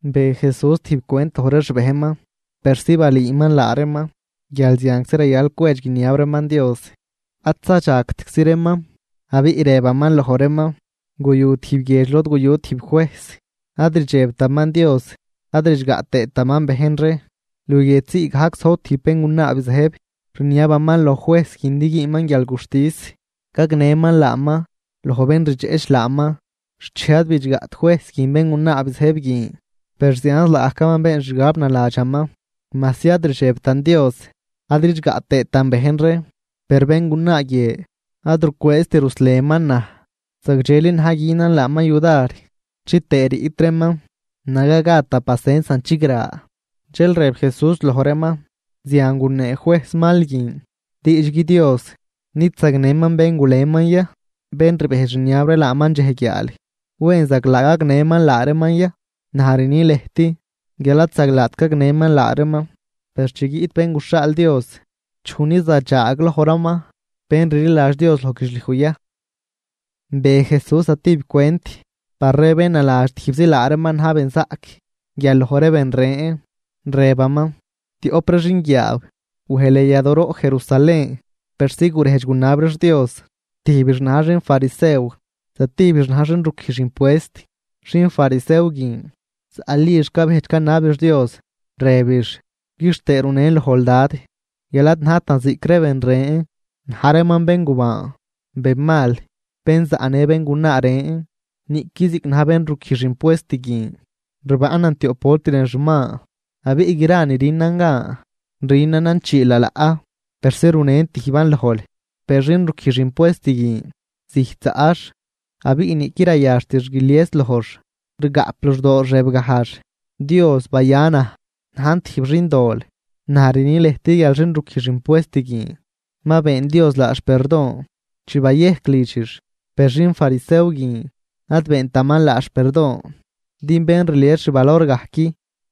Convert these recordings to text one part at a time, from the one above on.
Be Jesús tijb cwent loj ree xbejnman, persi balüüman laa reeman guial zianczi rayal cwedx guiniab reeman Dios ad zadxagtczi reeman. Abiꞌ rëbaman loj reeman: ―Guyu tijb guiedx lod guyu tijb juejs, ad rdxebtaman Dios ad ridxgaꞌ tëëtaman bejn ree. Luguiedx ziigajc zojb tijb béngunaa bizëjb, rniabaman loj juejs guin din güünman guialguxtis gagnëman laaman loj bén rdxeꞌch laaman. Xchej ad bidxgaꞌt juejs guin béngunaa bizëjb guin, per zianz laagajcaman been xgab naladxaman: “Majsi ad rdxebtan Dios ad ridxgaꞌ tëëtan bejn ree, per béngunaa guie ad rucwëëzt ruslenman naj. Zagdxeli na̱j günan laaman yudar chitëë riꞌtraman naga gad da pacensan chigra.” Dxel rëb Jesús loj reeman: ―Zian gunee juejs mal guin. Diidxgui Dios, ¿nid zagnëman bén guleman ya bén rbejdx rniab ree laaman dxej guiaal? ¿Wen zaglaa gagnëman laa reeman ya? Naj rni lëjt guial ad zaglaat gagnëman laa reeman. Per chi guiꞌt Bén guxhaal Dios, ¿chuj ni zadxaaglojraman bén rliladx Dios loj guidxliuj ya? Be Jesús zatijb cwent par ree bén naladx tijbzi laa reeman na̱j benzaꞌc guial loj ree ben ren, rëbaman: ―Tioꞌp ree xinguiaaw wej lën yadooroꞌ Jerusalén persi gurejdx gunab reex Dios, tijbix na̱j xinfarisew, zatijbix na̱j xin ruquijx impuest. Xin farisew guin, zaꞌlix cabejdx canabix Dios, rëbix: “Quixtëë runen lojl, Dad, guial ad najtan ziꞌc ree ben ren, na̱j reeman béngubaan, benmal, bén zaꞌnë béngunaa ren, niꞌqui ziꞌc na̱j bén ruquijx impuest guin. Rbaꞌnan tioꞌp volt lën xuman, abiꞌ gra ni rünan gan rünanan chii lalaꞌ persi runen tijban lojl.” Per xin ruquijx impuest guin, zijt zaꞌx abiꞌ niꞌquid rayaxtix guilies lojx, rgaꞌp luxdoox rëbgajx: “¡Dios, baya naj najn tijb xindol!” Naj rni lëjt guial xin ruquijx impuest guin ma been Dios laax perdon chi bayejc lidxix, per xin farisew guin ad beentaman laax perdon. Din bén rlies xvalor gajc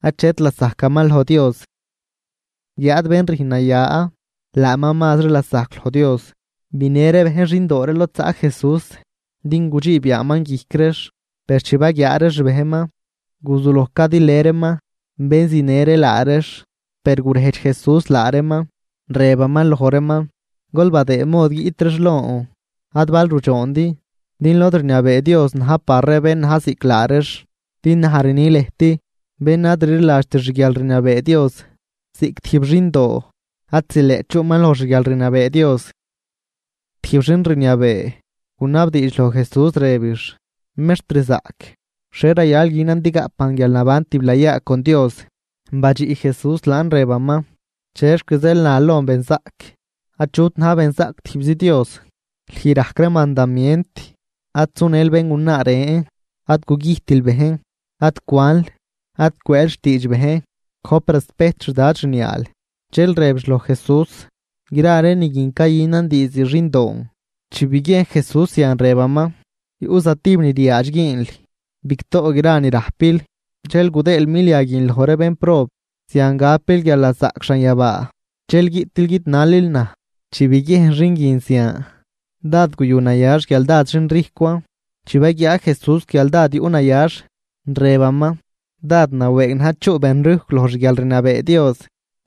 achet lasajcaman loj Dios, guiáad bén rüjn naya laaman mazri lasajc loj Dios. Binë ree bejn xindoo ree lod zaꞌ Jesús din gudxiib yaaman guijc reex, per chi baguiaa ree xbejnman guzuloj cadilë reeman bén zinë ree laa reex. Per gurejdx Jesús laa reeman, rëbaman loj reeman: ―Gol badëë mod guiꞌt reex lon, ad bal rudxoondi, din lod rniabee Dios na̱j par ree bén na̱j ziꞌc laa reex. Din naj rni lëjt, bén ad rliladxt xguialrniabee Dios ziꞌc tijb xindoo, ad zileꞌt chuꞌman loj xguialrniabee Dios. Tijb xin rniabee, gunabdiidx loj Jesús rëbix: ―Mextrzaꞌc, ¿xhie rayal günan din gaꞌpan guialnaban tiblayaa con Dios? Badxiꞌ Jesús laan, rëbaman: ―¿Chexc zeel nal lon benzaꞌc? Achut na̱j benzaꞌc, tijbzi Dios. Lüj rajc ree mandamient: “Ad sunël béngunaa ren, ad gugüjtil bejn, ad cwanl, ad cwëël xtiidx bejn, gojp respejt xdad xniaal.” Dxel rëbix loj Jesús: ―Gra ree ni guin cayünan diizd xindoon. Chi biguiejn Jesús zian, rëbaman: ―Yuꞌ zatijb ni ryaadx güünl: bigtoꞌ gra ni rajpil dxel gudëël milia guin loj ree bénprob. Zian gapil guialnazaꞌc xanyabaa, dxel guiꞌtil guidnalil naj. Chi biguiejn xin guin zian, dád guyunayax guial dád xinrijcwan. Chi baguiaa Jesús guial dád yuꞌnayax, rëbaman: ―¡Dád nawëëg na̱j chuꞌ benrijcw loj xguialrniabee Dios!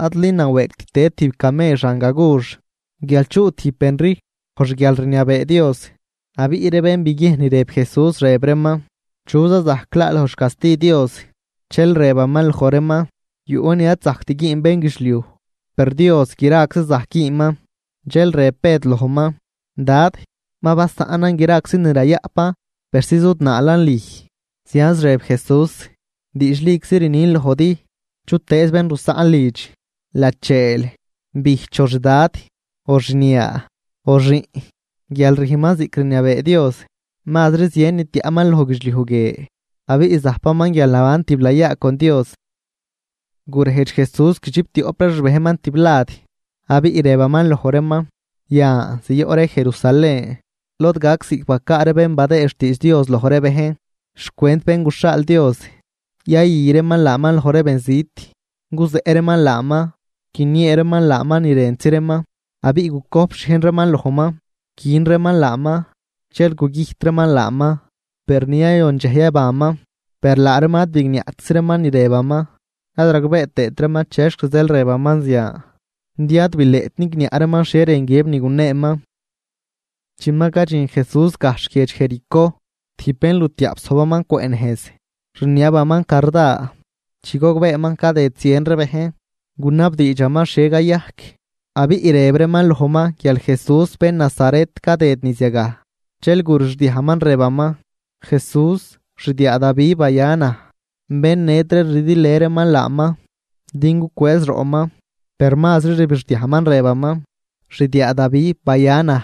Adli nawëëgt tëd tijb camell xan gagux, guial chuꞌ tijb bén rijcw loj xguialrniabee Dios. Abiꞌ ree bén biguiejn ni rëb Jesús, rëb reeman: ―¿Chu za zajc laa loj xcasti Dios? Dxel rëbaman loj reeman: ―Yuꞌ ni ad zajct güün bénguidxliuj, per Dios graczan zajc güünman. Dxel rëb Bëd lojman: ―Dad, ma basaꞌnan graczi ni rayaꞌpan persi zudnaalan lüj. Zianz rëb Jesús: ―Diidxliczi rnin lojdi, chutëëz bén rusaꞌn lidx, lacheel, bijch, o xdad, o xniaa, o xiꞌn guial rüjnman ziꞌc rniabee Dios, mazri zien ni tiaꞌman loj guidxliuj guie. Abiꞌ zajpaman guialnaban tiblayaa con Dios. Gurejdx Jesús guidxiptioꞌp ree xbejnman tiblad, abiꞌ rëbaman loj reeman: ―Yan, ziyoꞌ ree Jerusalén lod gac ziꞌc bacaa ree bén badëë xtiidx Dios loj ree bejn xcwent Bén guxhaal Dios. Yayü reeman laaman loj ree benzit, guzeꞌ reeman laaman, guiniee reeman laaman ni rëntzi reeman, abiꞌ gucojp xhiejn reeman lojman. Quin reeman laaman dxel gugüjt reeman laaman, per ni yayon dxej yabanman. Per laa reeman ad bigniaꞌtczi reeman ni rëbaman, ad ragbee tëët reeman chexc zeel rëbaman zian din ad bileꞌt nigniaꞌ reeman xhie rën guiëb ni guneeman. Chi ma cadxin Jesús gajxh guiedx Jericó, tijb bénlutiaꞌp, zojbaman cwëꞌ nejz rniabaman carda. Chi gogbeeman cadëd zien ree bejn, gunabdiidxaman xhie cayajc. Abiꞌ rëb reeman lojman guial Jesús bén Nazaret cadëd niz yagaj. Dxel gurixdiajman rëbaman: ―¡Jesús, xdiaa Davi, baya naj! Bén ned ree rdilë reeman laaman din gucwëëz roꞌman, per mazri rbixdiajman, rëbaman: ―¡Xdiaa Davi, baya naj!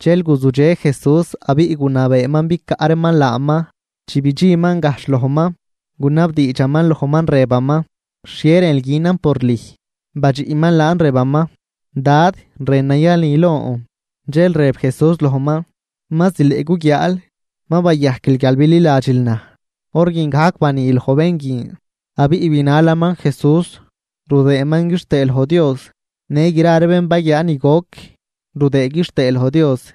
Dxel guzudxe Jesús abiꞌ gunabeeman bicaꞌ reeman laaman. Chi bidxinman gajxh lojman, gunabdiidxaman lojman, rëbaman: ―¿Xhie rënl günan por lüj? Badxiꞌman laan rëbaman: ―Dad, rënan yani lon. Dxel rëb Jesús lojman: ―¡Ma zileꞌ guguiaal! Ma bayajquil guial bililadxil naj. Hor guin gajc bani loj bén guin, abiꞌ binalaman Jesús rudëëman quixtëë loj Dios. Në gra ree bén baguiaa ni goc rudëë quixtëë loj Dios.